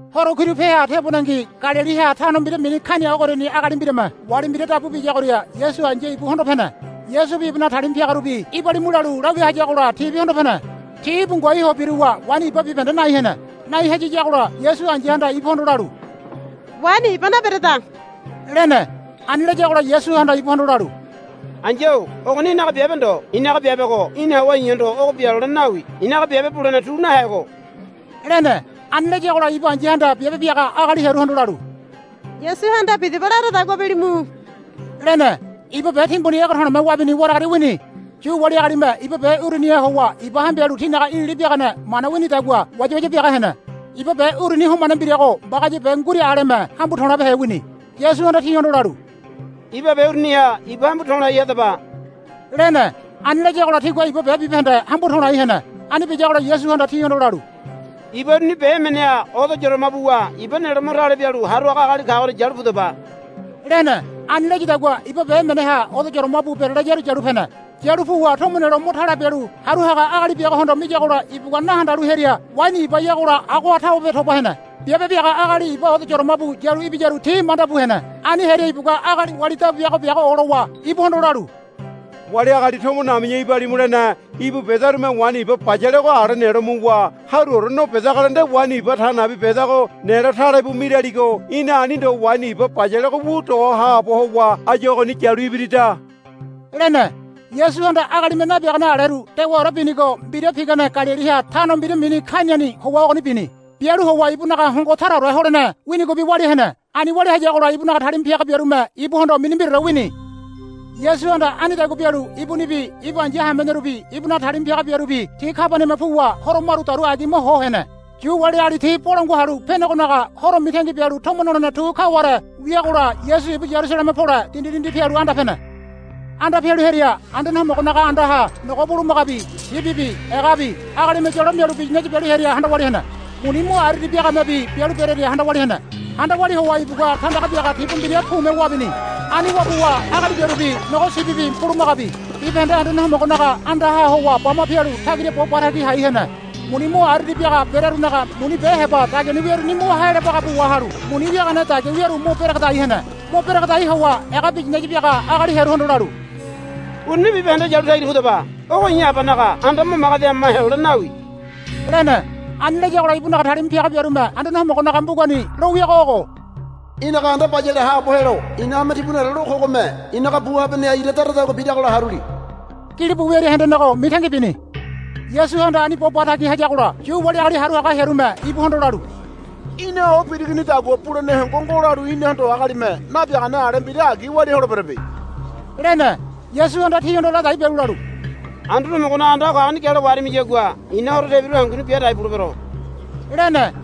Horo kiru peha tebonengi Galiliha tano mbira mini Kaina ogoriani agali mbirame wali mbira dabu biyagoria Yasu ai̱ya ibu hondo pene. Yasubi ibunaga talima piagarubi, Ibalimu, lalu lawia hayagola tibi hondo pene. Ti íbu ngoai ho biruwa waini iba bibahende nai hene. Nai hayiyagola Yasu ai̱yahanda ibuhondo lalu, Waini iba nabereda, lene. Ani layagola Yasuhanda ibuhondo lalu, Ai̱ya-o ogoni í̠naga biabe ndo. I̱naga biabego í̠na howa i̱hondo ogo bia lolene nawi. I̱naga biabe bulene tu nahego, lene. Ani layagola ibu ai̱yahanda biabe biaga agali hearuhondo lalu, Yasuhanda bidaba laradagua bilimu, lene. Iba be timbuni ege to̱le̱me wabini waragaria wini. Yu wali agalime iba be uruniha howa iba hambialu tinaga ilili biagane mana winidagua wayawaya biaga hene. Iba be uruni homane mbirago mbagaya be nguira aleme hambu to̱labehe wini. Yasuhanda tihondo lalu, Iba be uruniha iba hambu to̱lai hadaba, lene. Ani layagola tigua iba be bibahende hambu to̱lai hene. Ani biyagola Yasuhanda tihondo lalu, Iba uruni be emeneha odo yoroma buwa iba nelo mo tale bialu haru haga agali kagoria yalu pudaba, lene. Ani layadagua iba be emeneha odo yoroma bu berelayaru yalu pene. Yalu puwa tomo nelo mo tale bialu haru haga agali biagohondo miyagola ibugua na handalu hearia waini ibayagola agoha tawebe toba hene. Biabe biaga agali iba odo yoroma bu yalu ibiyaru ti manda bu hene. Ani hearia ibugua agali wali dabu biaga biago olowa ibuhondo lalu, Wali agali tomo nami̱ya ibalimu lene íbu bedarume waini iba bayalego ala nelo muwa haruore no bidagola nde waini iba ta nabi bedago nelo tale bu miraligo. Í̠na ani ndo waini iba bayalego wu doho haabo howa áyu ogoni yalu ibirida, lene. Yasuhanda agalime nabiagane aleru dewaore binigo mbira pigane Galiliha tano mbira mini Kainani howa ogoni bini. Bialu howa ibunaga hongo taraore holene winigobi walia hene. Ani walia hayagola ibunaga talima piaga biarume ibuhondo mini mbiraore wini. Yasuhanda anidagua bialu ibunibi ibu ai̱ya hamenerubi ibunaga talima piaga biarubi ti Kabaniama puwa horo maru dauru agima ho hene. Yu wali agali ti Bolangua Halu Penegonaga Horo mitangi bialu tomo nolene tu kaware wiagola Yasu ibu Yarusaleme pole dindi dindi pialu anda pene. Anda pialu hearia Anduane Homogonaga andaha nogo bulumagabi sibibi egabi agalime yolo mialu biyinaya bialu hearia handa walia hene. Muni mo ariari biagamebi bialu berearia handa walia hene. Handa walia howa ibugua tandaga biaga tibu mbira pume wabini. Ani wabuwa agali biarubi nogo sibibi bulumagabi bibahende Anduane Homogonaga andaha howa bama pialu tagira bo ba tagi hai hene. Muni mo ariari biaga berearunaga muni be heba dagiani wiaruni mo haealo baga bu wahalu muni wiagane dagia wiaru mo beregedai hene. Mo beregedai howa ega biyinaya biaga agali hearuhondo lalu, Uruni bibahende yalu tagira pudaba. Ogo i̱ Abanaga anda mo magedi hama helolene nawi, lene. Ani layagola ibunaga talima piaga biarume Anduane Homogonaga mbugani lo wiago ogo, Í̠naga anda bayale haabo helo i̱na hame timbuni lalu kogome i̱naga bu habaneha ira daradagua biragola haruli, gilibu wiaria hendenego mitangi bini. Yasuhanda ani bo ba tagi hayagola Yu wali agali haru haga hearume ibuhondo lalu, Í̠na o birigonidagua bulene hongo ngo lalu inahondo agalime nabiagane ale mbira agi walia holeberebe, lene. Yasuhanda tihondo ladai bialu lalu, Anduane Homogonaga anda o kagoni gialo waharimiyagua i̱na horo tebiru hanguni bia dai bulebero, lene.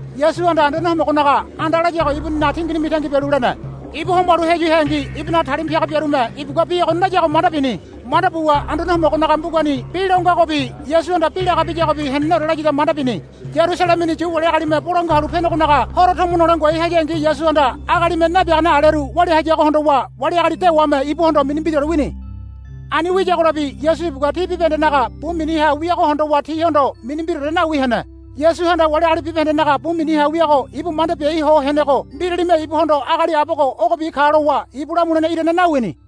Yasuhanda Anduane Homogonaga anda layago ibuninaga tingini mitangi bialu lene. Ibu homalu heyu heangi ibunaga talima piaga biarume ibugua bi ogoni layago manda bini. Manda buwa Anduane Homogonaga mbugani bi lo ngagobi Yasuhanda bi laga biyagobi heneneore layada manda bini. Yarusalemeni Yu wali agalime Bolangua Halu Penegonaga Horo tomo nole ngoai hayangi Yasuhanda agalime nabiagane aleru walia hayago hondowa wali agali dewame ibuhondo mini mbiraore wini. Ani wiyagolabi Yasu ibugua ti bibahendenaga bu miniha wiago hondowa tihondo mini mbiraore nawi hene. Yasuhanda wali agali bibahendenaga bu miniha wiago ibu manda biai ho henego mbiralime ibuhondo agali abogo ogobi ka lowa ibu lamulene irane nawini.